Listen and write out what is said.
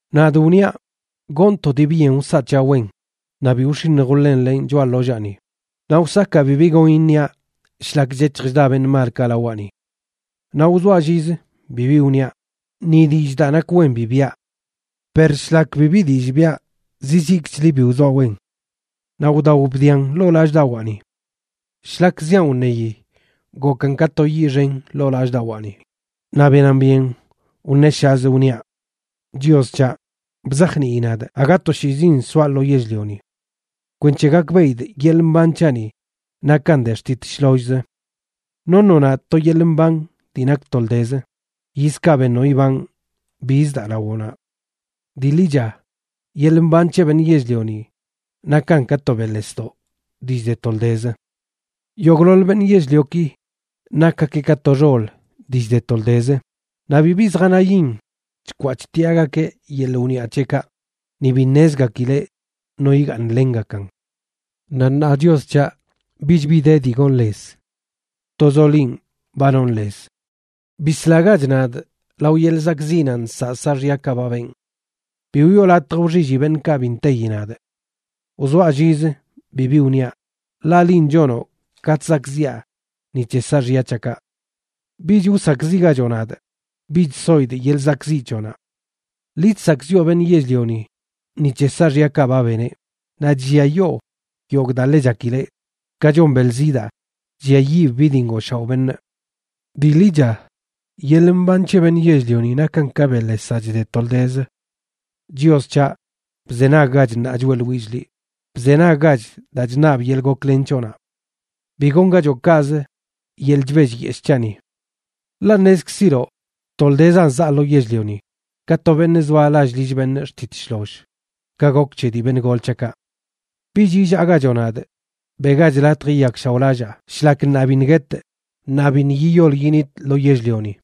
Nadꞌ wniaꞌ: “Gonꞌ to dii byen wsaꞌ c̱haꞌ wen, naꞌ bi wx̱iṉj wḻenlenꞌ choꞌa ḻollaani, naꞌ wsakaa bibi gon iṉiaꞌ shlak chec̱hj chda beṉꞌ malkaꞌ lawaꞌni.” Naꞌ wzoaꞌ llizə, bibi wniaꞌ, ni dillꞌ daa nak wen bi biꞌa. Per shlak bibi dillꞌ biꞌa zizikchli bi wzoaꞌ wen. Naꞌ wdao bdian ḻoo lallꞌdawaani. Shlak ziaꞌn wṉeyi, gokan ka to yiꞌ xen ḻoo lallꞌdawaani naꞌ benan byen wṉeshazꞌ wniaꞌ: “Chios c̱haꞌ, bzajnii nadꞌ aga toshiizin soaꞌ lo yell-lioni, kwenc̱he gakbeꞌidꞌ yeḻꞌ mban c̱haꞌni nakan de xtit shlollzə. Noṉoꞌ nadꞌ to yeḻꞌ mban dii nak toldezə; yizkaꞌ beṉoꞌ ibanꞌ, biz daa lawoꞌnaꞌ. Dii ḻicha, yeḻꞌ mban c̱he beṉꞌ yell-lioni nakan ka to beꞌḻesdoꞌ dii chde toldezə. Yogꞌḻoḻ beṉꞌ yell-lioki nakgakeꞌ ka to xol dii chde toldezə; naꞌ bibi zjanayin chkwaa chtiꞌagakeꞌ yeḻꞌ wniꞌa c̱heꞌkaꞌ, ni bi ṉezgakileꞌ no yigaaṉlengakan. Naꞌ ṉaa, Chios c̱haꞌ, bich bi de dii gonꞌ lez. Tozoꞌ linꞌ ba nonꞌ lez. Bislagach nadꞌ lao yeḻꞌ zakꞌziꞌnaꞌ nsaꞌ saaxyakaꞌ ba benꞌ. Bi wiꞌo latj wxilli beṉꞌkaꞌ bi nteyi nadꞌ. “Wzoaꞌ llizə, bibi wniaꞌ, ḻaꞌ linꞌ chonoꞌ ka chzakꞌziꞌa ni c̱he saaxya c̱haꞌkaꞌ. Bich wsakꞌziꞌgachoꞌ nadꞌ; bich soidꞌ yeḻꞌ zakꞌziꞌ c̱hoꞌnaꞌ. Liꞌ chzakꞌziꞌo beṉꞌ yell-lioni ni c̱he saaxyakaꞌ ba beneꞌ, naꞌ chlliayoo yogꞌ daa ḻe chakileꞌ, ka chon beḻ zidaa chlliayiꞌb bi dii ngooshaoꞌ beṉꞌ. Dii ḻicha, yeḻꞌ mban c̱he beṉꞌ yell-lioni nakan ka beꞌḻesaꞌ chde toldezə. “Chios c̱haꞌ, bzenaggach ṉaa choeꞌḻwillꞌ liꞌ, bzenaggach daa chṉabꞌ yeḻꞌ goklen c̱hoꞌnaꞌ. Bi gongachoꞌ kaꞌz yeḻꞌ chbellyeshꞌ c̱haꞌni. Ḻaꞌ ṉezkziloꞌ toldezan zaa lo yell-lioni, ka to beṉꞌ zoa lall lill beṉꞌ xtit shloll, ka gok c̱he dii beṉꞌ gol c̱haꞌkaꞌ. Bich illaagachoꞌ nadꞌ, beꞌgach latj yiyakshaoꞌlallaa shlak ṉaa biṉꞌ guetꞌ naꞌ biṉꞌ yiyol yinitꞌ lo yell-lioni.”